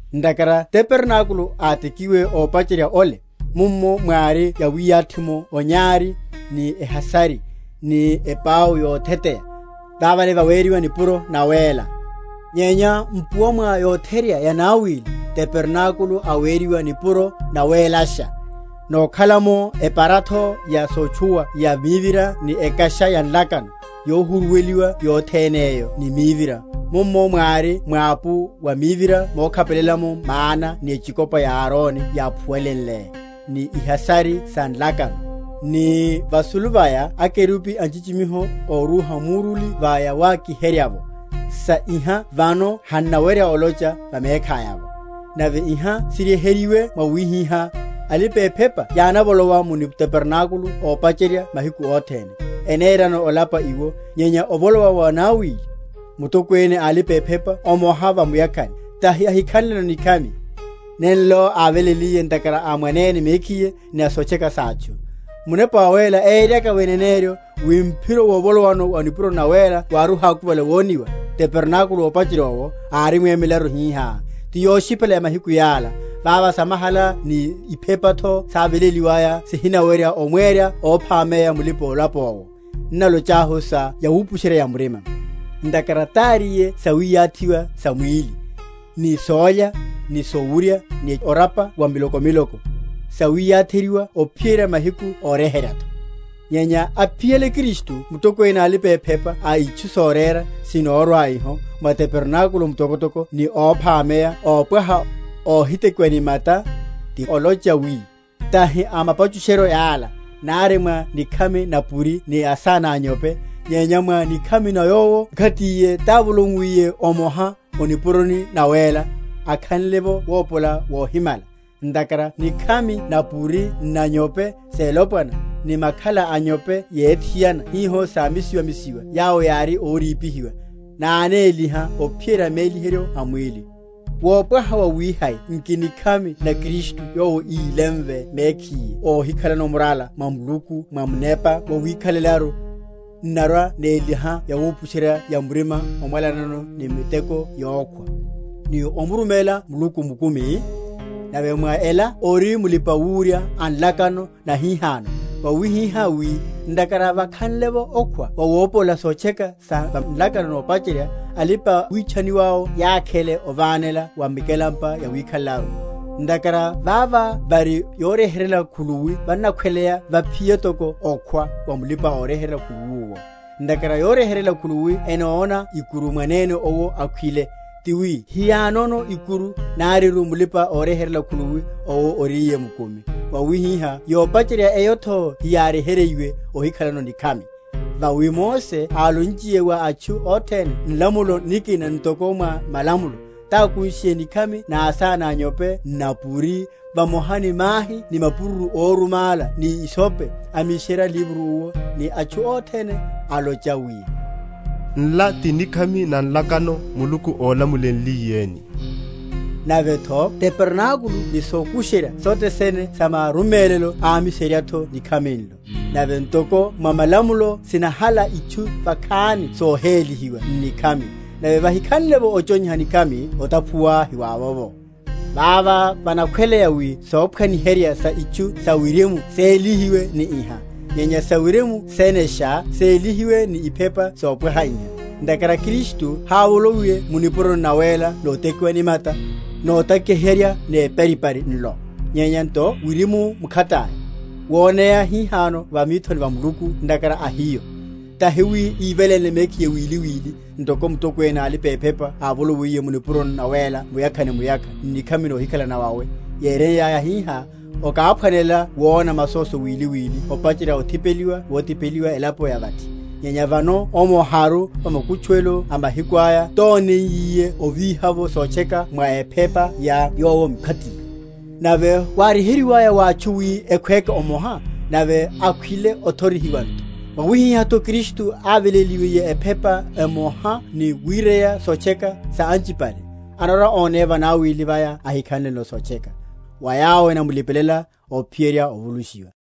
Ntakhara tabernákulo átekiwe, ópacherya ole, mummo mwári yawiyathi’vo onyari, ni ehasari, ni epau yotheteya; vavale veriwa Nipuro Nawéla: Nyenya mpuwa mwa yotherya yanawili, tabernákulo aweriwa Nipuro Nawélasha; nokhala’mo eparatho ya sotchuwiha ya mivira ni ekasha ya nlakano, yohuruweliwa yothenéyo ni mivira, mummo mwári mwapu wa mivira mokhapelela’mo mana ni echikopa ya Aroni yáphuwaléle, ni ihasari sa nlakano; ni vasulu vaya akerubi a nchichimiho órúha muruli va yawakiherya’vo; sa iha vano hannawerya olocha va mekhaya’vo. Nave iha siryeheryiwe mwawihihá, alipa‐ephepa yánavolowa mu tabernákulo ópacherya mahiku othene, enerano olapa iwo; nyenya ovolowa mwanawili, mutokwene a alipa‐ephepa omoha va muyakhani, tahi ahikhanleno nikhami, nenlo áveléliye ntakhara a mwanene mekhiye, ni sotcheka sa atchu; Munepa Wawéla éyeryaka’vo eneneryo, wi mphiro wovolowano o nipuroni nawéla wári ohákuvale wonihiwa, tabernákulo ópacherya owo arimwemelaru hihá; ti yoshipela ya mahiku yala, vava samahala ni iphepatho sáveléliwaya sihinawerya omwera óphameya mulipa‐olapa owo, n’nalochahu sa yawupusherya‐ya‐murima. Ntakhara taríye sawiyathiwa sa mwíliru (ni sólya, ni sowurya, ni orapa wa miloko miloko), sawiyatheryiwa ophiyerya mahiku óryeheryatho. Nyenya aphiyale Kristu Mutokwene a alipa‐ephepa a itchu sorera sinorwa iho, mwa tabernákulo mtokotoko ni óphameya ópwaha, óhitekiwa ni mata, ti olocha wi, tahi a mapachusheryo yala, nari mwa nikhami na’puri ni asána a’nyope, nyenya mwa nikhami na Yowo mkhatiye távoloiyiye omoha, o nipuroni nawéla, akhanle’vo wopola wohimala. Ntakhara nikhami na’puri n’na’nyope selopwana, ni makhala a’nyope yethiana hiho sámisiwamisiwa yawo yári órípihiwa, nánéliha ophiyerya méliheryo a mwíli; wopwaha wawihai nki nikhami na Kristu yowo ílemve mekhiye óhikhalano murala wa Muluku mwa Munepa wawikhalelaru, n’narwa‐néliha yawupusheryányu‐ya‐murima omwalanya ni miteko yokhwa, ni omuruméla Muluku mukumi? Nave mwa ela ori Mulipa‐wurya a nlakano nahihano, wawihihá wi, ntakhara vakhanle’vo okhwa wawopola sotcheka sa va nlakano nopacherya, alipa‐witchaniwáwo yakhele ovánela wa mikelampa yawikhalelaru. Ntakhara vavo vari yoryeheryela khuluwi vanakhweleya vaphiye toko okhwa wa mulipa‐oryeheryela khuluwi owo. Ntakhara yoryeheryela khuluwi enóna ikuru mwanene owo akhwile; tiwi hiyanono ikuru nariru mulipa‐oryeheryela khuluwi owo oríye mukumi; mwawihiha yopacherya eyotho hiyáryeheryiwe ehikhanleno nikhami. Vawi Mose álonchiye wa atchu othene nlamulo nikina ntoko mwa malamulo, tákushiye nikhami na asána a’nyope n’napuri, vamoha ni mahi ni mapururu órumála ni hisope, amiserya livro owo, ni atchu othene, alocha wi, Nla ti nikhami na nlakano Muluku ólamulenliyeni. Navetho tabernákulo ni sokusherya sothe sene sa marumélelo ámiseryatho n’nikhami nlo. Nave ntoko mwa malamulo sinahala itchu vakhani sohélihiwa n’nikhami, nave vahikhanle’vo ochonyiha nikhami otaphuwatho hiwavovo. Vavo vanakhweleya wi sophwaniherya sa itchu sa wirimu sélihiwe ni iha; nyenya sawirimu senesha sélihiwe ni iphepa sopwaha iha. Ntakhara Kristu hávoloiye mu nipuroni nawéla notekiwa ni mata, notakiherya neparipari nlo; nyenya nto wirimu mkhataya, woneya hihano va mithoni va Muluku ntakhara a hiyo; tahi wi íveléle mekhiye wili wili; ntoko Mutokwene a alipa‐ephepa ávolowiye mu nipuroni nawéla muyakha ni muyakha n’nikhami nohikhala nawawe; yéreya hihá, okáphwanelela wona masóso wili wili opacherya othipeliwa wothipeliwa elapo ya vathi; nyenya vano omoharu va makutchuwelo a mahiku aya tóneiyiye ovíha’vo sotcheka mwa ephepa ya Yowo mkhatiye. Nave wáryeheryiwaya wa atchu wi ekhwéke omoha, nave akhwile, othorihiwa nto; mwawihihá Kristutho aveléliwe ephepa omoha ni wireya sotcheka sa anchipale, anarwa‐oneya vanawili vaya, ahikhanleno sotcheka, wa yawo enamlipelela, ophiyerya ovulushiwa.